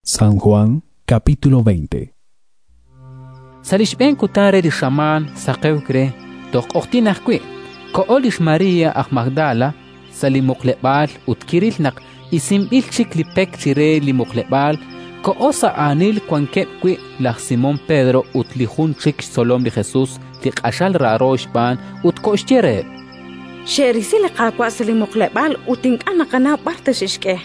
Kiril ut kixpaab' Sa' li xb'een kutan re li xamaan, saqewk re, toj q'oqyink ajwi', koho lix María aj Magdala sa' li muqleb'aal ut kiril naq isinb'il chik li pek chire li muqleb'aal. Koho sa' aanil wankeb' wi' laj Simón Pedro ut li jun chik xtzolom li Jesus li q'axal raaro xb'aan, ut koxye reheb': —Xe'risi li Qaawa' sa' li muqleb'aal ut ink'a' naqanaw b'ar ta xe'xk'e.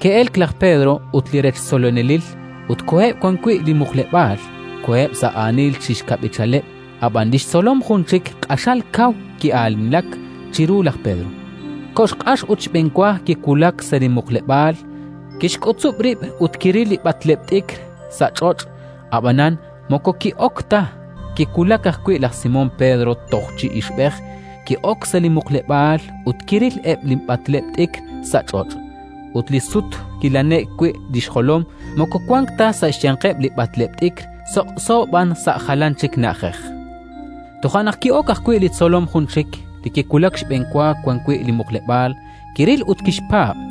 Ke'elk laj Pedro ut li rech tzolonelil, ut koheb' wan wi' li muqleb'aal. Koheb' sa' aanil chi xkab'ichaleb', ab'an li xtzolom jun chik q'axal kaw ki'aanilak chiru laj Pedro, koxq'ax ut xb'enwa kiwulak sa' li muqleb'aal. Kixk'utzub' rib' ut kiril eb' li b'atleb' t'ikr sa' ch'och', ab'anan moko ki'ok ta. Kiwulak ajwi' laj Simón Pedro toj chi ixb'ej, ki'ok sa' li muqleb'aal, ut kiril eb' li b'atleb' t'ikr sa' ch'och' ut li sut kilane'k wi' li xjolom: moko wank ta sa' xyanqeb' li b'atleb' t'ikr, soq'so b'an sa' jalan chi na'ajej. Toja' naq ki'ok ajwi' li tzolom jun chik, li kiwulak xb'enwa wan wi' li muqleb'aal; kiril ut kixpaab'.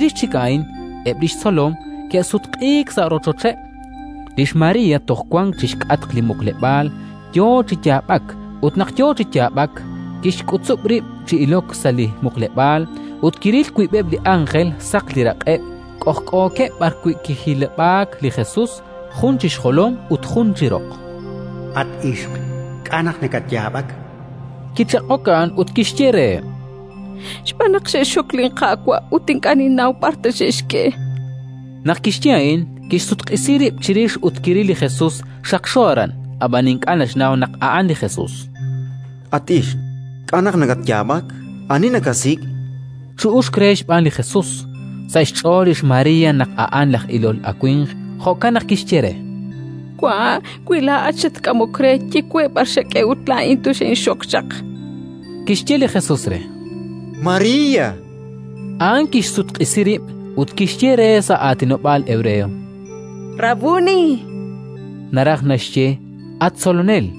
Chirix chik a'in eb' li xtzolom ke'sutq'iik sa' rochocheb'. Lix María toj wank chi xk'atq li muqleb'aal, yo chi yaab'ak. Ut naq yo chi yaab'ak, kixk'utzub' rib' chi ilok sa' li muqleb'aal, ut kiril wiib'eb' li ánjel, saq li raq'eb', k'ojk'ookeb' b'arwi' kijilib'aak li Jesus: jun chi xjolom ut jun chi roq. —At ixq, k'a' naq nakatyaab'ak? chankeb' re. Kichaq'ok a'an ut kixye reheb': —Xb'aan naq xe'xxok linQaawa' ut ink'a' ninnaw b'ar ta xe'xk'e. Naq kixye a'in, kixsutq'isi rib' chirix ut kiril li Jesus xaqxo aran; ab'an ink'a' naxnaw naq a'an li Jesus. —At ixq, k'a' naq nakatyaab'ak? Ani nakasik'? chu'uxk re xb'aan li Jesus. Sa' xch'ool lix María naq a'an laj ilol awimq; jo'kan naq kixye re: —Wa', wi laa'at xatk'amok re, ye we b'ar xak'e ut laa'in toxinxok chaq. Kixye li Jesus re: —María! A'an kixsutq'isi rib' ut kixye re sa' aatinob'aal hebreo: —Rabbuní! (naraj naxye: “At Tzolonel!”).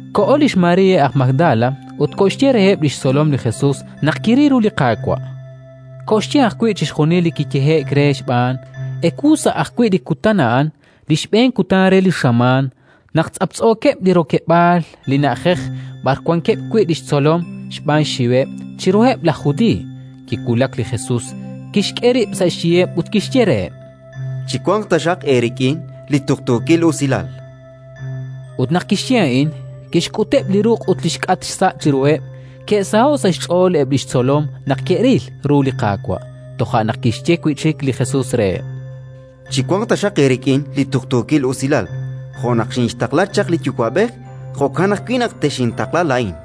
Koho lix María aj Magdala ut koxye reheb' li xtzolom li Jesus naq kiril ru li Qaawa'; koxye ajwi' chixjunil li kiyehe'k re xb'aan. Ewu sa' ajwi' li kutan a'an, li xb'een kutan re li xamaan, naq tz'aptz'ookeb' li rokeb'aal li na'ajej b'ar wankeb' wi' li xtzolom xb'aan xxiweb' chiruheb' laj Judiiy, kiwulak li Jesus, kixk'e rib' sa' xyiheb' ut kixye reheb': —Chiwanq taxaq eerik'in li tuqtuukil usilal! Ut naq kixye a'in, kixk'uteb' li ruq' ut li xk'atq xsa' chiruheb'. Ke'saho'k sa' xch'ool eb' li xtzolom naq ke'ril ru li Qaawa'. Toja' naq kixye wi' chik li Jesus reheb': —Chiwanq taxaq eerik'in li tuqtuukil usilal. Jo' naq xinxtaqla chaq li Yuwa'b'ej, jo'kan ajwi' naq texintaqla laa'in.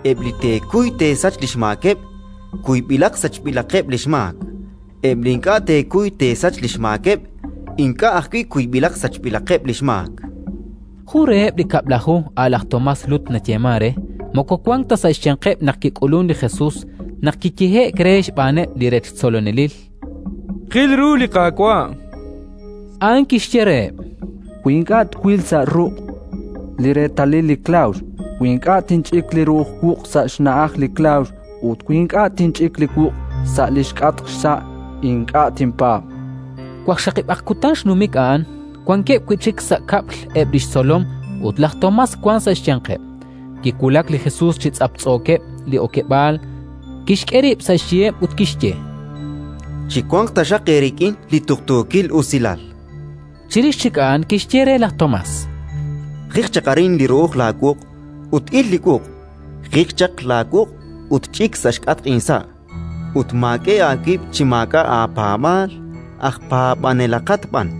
Eb' li teekuy teesach li xmaakeb', kuyb'ilaq sachb'ilaqeb' li xmaak; eb' li ink'a' teekuy teesach li xmaakeb', ink'a' ajwi' kuyb'ilaq sachb'ilaqeb' li xmaak. Jun reheb' li Kab'laju, a' laj Tomás, Lut nayeemank re, moko wank ta sa' xyanqeb' naq kik'ulunk li Jesus. Naq kiyehe'k re xb'aaneb' li rech tzolonelil: “Xqil ru li Qaawa'”, a'an kixye reheb': —Wi ink'a' twil sa' ruq' li reetalil li klawx, wi ink'a' tinch'ik li ru'uj wuq' sa' xna'aj li klawx ut wi ink'a' tinch'ik li wuq' sa' li xk'atq xsa', ink'a' tinpaab'. Waqxaqib'aq kutan xnumik a'an, wankeb' wi' chik sa' kab'l eb' li xtzolom ut laj Tomás wank sa' xyanqeb'. Kiwulak li Jesus chi tz'aptz'ookeb' li okeb'aal, kixk'e rib' sa' xyiheb' ut kixye: —Chiwanq taxaq eerik'in li tuqtuukil usilal! Chirix chik a'an kixye re laj Tomás: —Jiq chaq arin li ru'uj laawuq' ut il li wuq'. Jiq chaq laawuq' ut ch'ik sa' xk'atq insa', ut maak'e aawib' chi maak'a' aapaab'aal, aj paab'anelaqat b'an.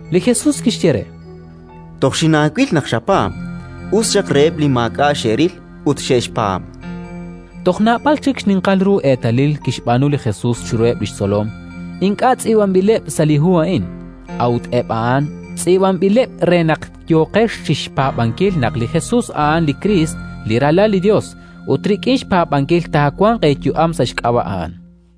Li Jesus kixye re: —Toj xinaawil naq xapaab'. Us xaq reheb' li maak'a' xe'ril ut xe'xpaab'. Toj naab'al chik xninqal ru eetalil kixb'aanu li Jesus chiruheb' li xtzolom, ink'a' tz'iib'anb'ileb' sa' li hu a'in. A'ut eb' a'in tz'iib'anb'ileb' re naq yooqex chi xpaab'ankil naq li Jesus a'an li Kriist, li Ralal li Yos, ut rik'in xpaab'ankil taawanq eeyu'am sa' xk'ab'a' A'an.